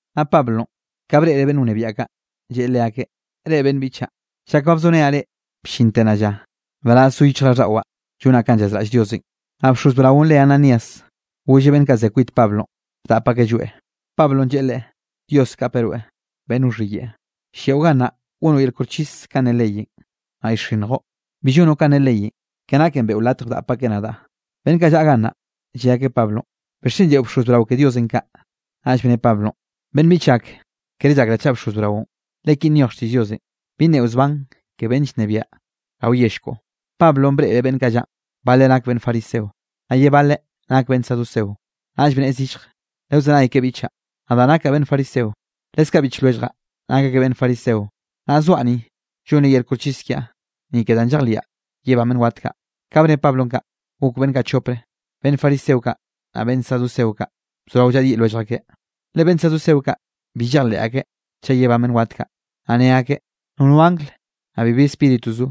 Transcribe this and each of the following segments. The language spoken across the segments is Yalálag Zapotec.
Naꞌ Pablonꞌ, ka breꞌreꞌ beꞌnn wnebiaꞌ kaꞌ, lleꞌe leakeꞌ: —Reꞌ beꞌnn biꞌchaꞌ, chak ba bzorenaꞌ reꞌ bllinte nnaꞌ lla, nbaraz zo yichjraꞌlldaꞌwaꞌ llonaꞌ kanꞌ llazraꞌll Diosenꞌ. Naꞌ bxoz braonꞌ re Ananías golleꞌ beꞌnn kaꞌ ze kwit Pablonꞌ, bdap akeꞌ lloeꞌ. Pablonꞌ lleꞌe leꞌe: —Dios kapeꞌ rweꞌ, beꞌnn wxhiyeꞌe, lliaꞌo gannaꞌ, gonoꞌ yel koxchis kanꞌ ne leyenꞌ, naꞌ llxinnjoꞌ, bi llonoꞌ kanꞌ ne leyenꞌ ke naken beꞌo latj bdap akeꞌ nadaꞌ. Beꞌnn kaꞌ llaꞌa gannaꞌ, lle akeꞌ Pablonꞌ: —¿Bixchen lleꞌo bxoz brao ke Diosenꞌ kaꞌ? Naꞌll bne Pablonꞌ: —Beꞌnn biꞌchaꞌ ak, kere llakraꞌ chaꞌ bxoz braonꞌ, le ki nyoj xtiꞌll Diosenꞌ: “Bi nneꞌo zban ke beꞌnnenꞌ llnebiaꞌ rao yell koꞌo.” Pablonꞌ breꞌreꞌ beꞌnn kaꞌ llaꞌn, baleꞌ nak beꞌnn fariseo, naꞌ ye baleꞌ nak beꞌnn saduceo, naꞌll bnneꞌe zillje: —Lewzenay ke biꞌchaꞌ, nadaꞌ nakaꞌ beꞌnn fariseo, leskaꞌ biꞌch lwelljaꞌ nak akeꞌ beꞌnn fariseo. Naꞌ zoaꞌ ni, llonre yel koxchis kiaꞌ, ni ke danꞌ llejliaꞌ yebán beꞌnn wat kaꞌ. Ka bne Pablonꞌ kaꞌ, gok beꞌnn kaꞌ chopre, beꞌnn fariseo kaꞌ, naꞌ beꞌnn saduceo kaꞌ, bzorao llaꞌdyiꞌ lwellj akeꞌ. Le beꞌnn saduceo kaꞌ, bi llejleꞌ akeꞌ chaꞌ yebán beꞌnn wat kaꞌ, naꞌ ne akeꞌ nono angl, naꞌ bibi spíritu zo.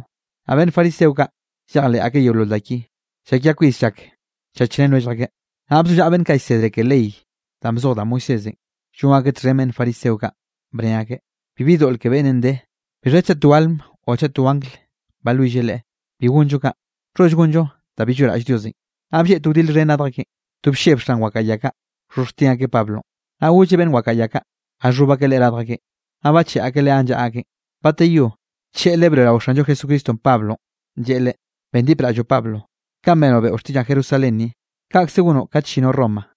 Naꞌ beꞌnn fariseo kaꞌ llejleꞌ akeꞌ yeolol da ki. Llakia kwis llak llchachrén lwellj akeꞌ. Naꞌ bzollaꞌa beꞌnn kaꞌ llsedre ke ley danꞌ bzoj da Moisésenꞌ, llon akeꞌ txhen beꞌnn fariseo kaꞌ, bne akeꞌ: —Bibi doꞌl ke beꞌnnenꞌ de, bixha chaꞌ to alm o chaꞌ to angl balwill leꞌe, bi gonllo kaꞌ, nxholl gonllo da bi lloꞌraꞌll Diosenꞌ. Naꞌ blleꞌ to wdil xhen radj akeꞌn, to blleb xan wakaꞌa ya kaꞌ wxhoxhjtin akeꞌ Pablonꞌ. Naꞌ golleꞌ beꞌnn wakaꞌa ya kaꞌ, jaxhob akeꞌ leꞌe radj akeꞌn, naꞌ bacheꞌe akeꞌ leꞌe ganꞌ llaꞌa akeꞌn. Bateyó, tlleꞌle broeꞌrao Xanllo Jesucristonꞌ, Pablonꞌ, lleꞌe leꞌe: —Bendipraꞌll Pablo, kanꞌ benoꞌ beꞌo xtiꞌllaꞌn Jerusalén ni, kaꞌkze gonoꞌ kat llinoꞌ Roma.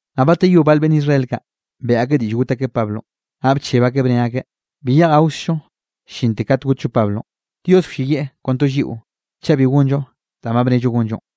Naꞌ bateyó bal beꞌnn Israel kaꞌ, beꞌe akeꞌ diꞌll got akeꞌ Pablonꞌ, naꞌ bcheb akeꞌ bne akeꞌ: —Bi yeꞌj gaokzllo llinte kat gotllo Pablonꞌ, Dios wlleyieꞌ kon to lliꞌo chaꞌ bi gonllo danꞌ ba bnello gonllo.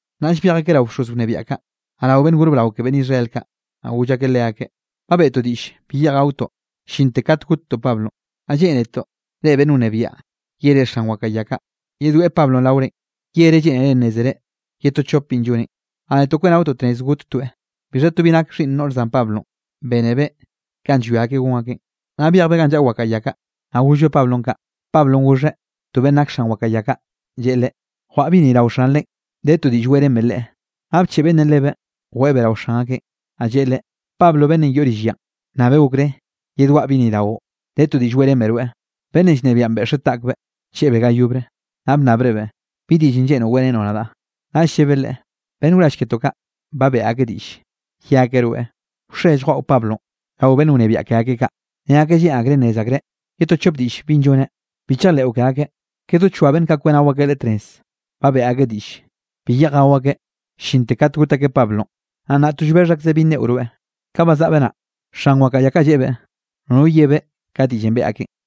Naꞌll byej akeꞌ rao bxoz wnebiaꞌ kaꞌ, naꞌ rao beꞌnn gor brao ke beꞌnn Israel kaꞌ, naꞌ goll akeꞌ leakeꞌ: —Ba bentoꞌ diꞌll bi yeꞌj gaotoꞌ llinte kat gottoꞌ Pablonꞌ. Naꞌ lleꞌnetoꞌ reꞌ beꞌnn wnebiaꞌ yere xan wakaꞌa ya kaꞌ, yedweꞌe Pablonꞌ raorenꞌ, yereꞌ lleꞌnere nnézere ye to chop binꞌ lloneꞌ, naꞌ netoꞌ kweꞌnaotoꞌ tnez gottoeꞌ. Bixha to bi nak xhiꞌnn noꞌr zan Pablonꞌ, bénebeꞌ kanꞌ llwia akeꞌ gon akeꞌn, naꞌ byejbeꞌ ganꞌ llaꞌa wakaꞌa ya kaꞌ, naꞌ gollbeꞌ Pablonꞌ kaꞌ. Pablonꞌ goxheꞌ to beꞌnn nak xan wakaꞌa ya kaꞌ, lleꞌe leꞌe: —Jwaꞌa bi ni rao xanrenꞌ, de to diꞌll weꞌrenbeꞌ leꞌe. Naꞌ bcheꞌe beꞌnnenꞌ lebeꞌ, jweꞌebeꞌ rao xan akeꞌn, naꞌ lleꞌe leꞌe: —Pablonꞌ beꞌnnenꞌ yoꞌ rill yanꞌ bnnabeꞌ okré yedwaꞌa bi ni raoꞌn, de to diꞌll weꞌrenbeꞌ rweꞌ. Beꞌnnenꞌ llnebiaꞌn beꞌxeꞌ taꞌkbeꞌ, bcheꞌebeꞌ ga yobre, naꞌ bnnabrebeꞌ: —¿Bi diꞌllenꞌ lleꞌnroꞌ weꞌrenoꞌ nadaꞌ? Naꞌll llebeꞌ leꞌe: —Beꞌnn wrall ketoꞌ kaꞌ, ba beꞌe akeꞌ diꞌll, ye akeꞌ rweꞌ, wxe lljwaꞌo Pablonꞌ rao beꞌnn wnebiaꞌ ke akeꞌ kaꞌ, nne akeꞌ lleꞌn akreꞌ nnez akreꞌ ye to chop diꞌll binꞌ lloneꞌ. Bi chejleꞌo ke akeꞌ, ke do choa beꞌnn kaꞌ kweꞌnao akeꞌ leꞌe tnez, ba beꞌe akeꞌ diꞌll, bi yeꞌj gao akeꞌ llinte kat got akeꞌ Pablonꞌ. Naꞌ nnaꞌ to llbexh akzeꞌ bi nneꞌo rweꞌ. Ka bazaꞌbeꞌ naꞌ, xan wakaꞌa ya kaꞌ lleꞌebeꞌ, nono yebeꞌ ka diꞌllenꞌ beꞌe akeꞌn.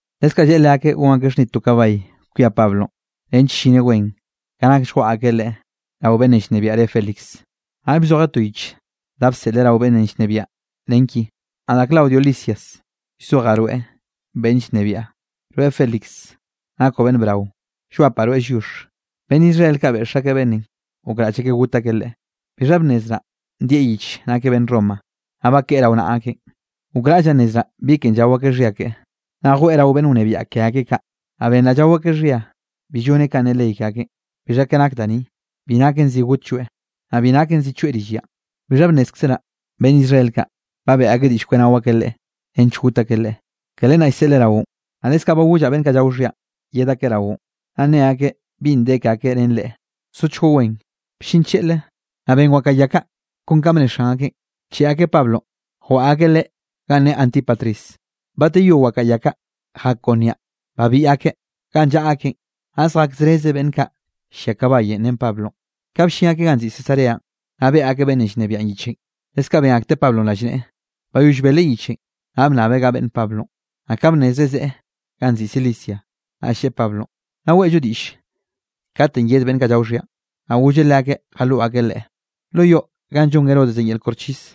Leskaꞌ lleꞌe leakeꞌ gon akeꞌ xhnid to kabay kwia Pablonꞌ nench llineꞌ wen ka nak lljwaꞌa akeꞌ leꞌe rao beꞌnnenꞌ llnebiaꞌn re Félix. Naꞌll bzojeꞌ to yich da bseꞌleꞌ rao beꞌnnenꞌ llnebiaꞌn nen ki: “Nadaꞌ Claudio Lisias, llzojaꞌ rweꞌ beꞌnn llnebiaꞌ, rweꞌ Félix, nakoꞌ beꞌnn brao, llwapaꞌ rweꞌ lliox. Beꞌnn Israel kaꞌ beꞌx akeꞌ beꞌnnenꞌ gokraꞌll akeꞌ got akeꞌ leꞌe. Bixha bnnezraꞌ ndieꞌ yich nakeꞌ beꞌnn Roma, naꞌ bakeꞌe rao naꞌa akeꞌn. Gokraꞌllaꞌ nnezraꞌ bi ken llao akeꞌ xhia keꞌe, naꞌ jweꞌe rao beꞌnn wnebiaꞌ ke akeꞌ kaꞌ. Naꞌ benraꞌ llao akeꞌ xhia bi lloneꞌ ka ne ley ke akeꞌn. Bixha ke nak da ni, bi naken zi gotlloeꞌ, naꞌ bi naken zi choeꞌ rill yanꞌ. Bixha bnnézkzeraꞌ beꞌnn Israel kaꞌ beꞌe akeꞌ diꞌll kweꞌnao akeꞌ leꞌe nench got akeꞌ leꞌe. Ke len naꞌ llseꞌleꞌ raoꞌn, naꞌ leskaꞌ ba gollaꞌ beꞌnn kaꞌ llao xhianꞌ yed akeꞌ raoꞌn, naꞌ nne akeꞌ binꞌ de ke akeꞌ ren leꞌe. Sochgoꞌ wen.” Bllin tlleꞌle, naꞌ ben wakaꞌa ya kaꞌ kon kanꞌ bne xan akeꞌ, bcheꞌe akeꞌ Pablonꞌ, jwaꞌa akeꞌ leꞌe ganꞌ ne Antípatris. Bateyó wakaꞌa ya kaꞌ jak kon niaꞌ babiꞌ akeꞌ ganꞌ llaꞌa akeꞌn naꞌ zjak zreze beꞌnn kaꞌ llia kabayenꞌ ren Pablonꞌ. Ka bllin akeꞌ ganꞌ nziꞌi Cesareanꞌ, naꞌ beꞌe akeꞌ beꞌnnenꞌ llnebiaꞌn yichenꞌ, leskaꞌ ben akteꞌ Pablonꞌ rallneꞌe. Bayoll beleꞌ yichenꞌ naꞌ bnnabeꞌ ga beꞌnne Pablonꞌ, naꞌ ka bnnezreꞌ zeꞌe ganꞌ nziꞌi Cilicia, naꞌll lleꞌe Pablonꞌ: —Nnaꞌ weꞌllo diꞌll katenꞌ yed beꞌnn kaꞌ llao xhianꞌ. Naꞌ golleꞌ leakeꞌ jaloꞌ akeꞌ leꞌe lo yoꞌ ganꞌ llon Herodes yel koxchis.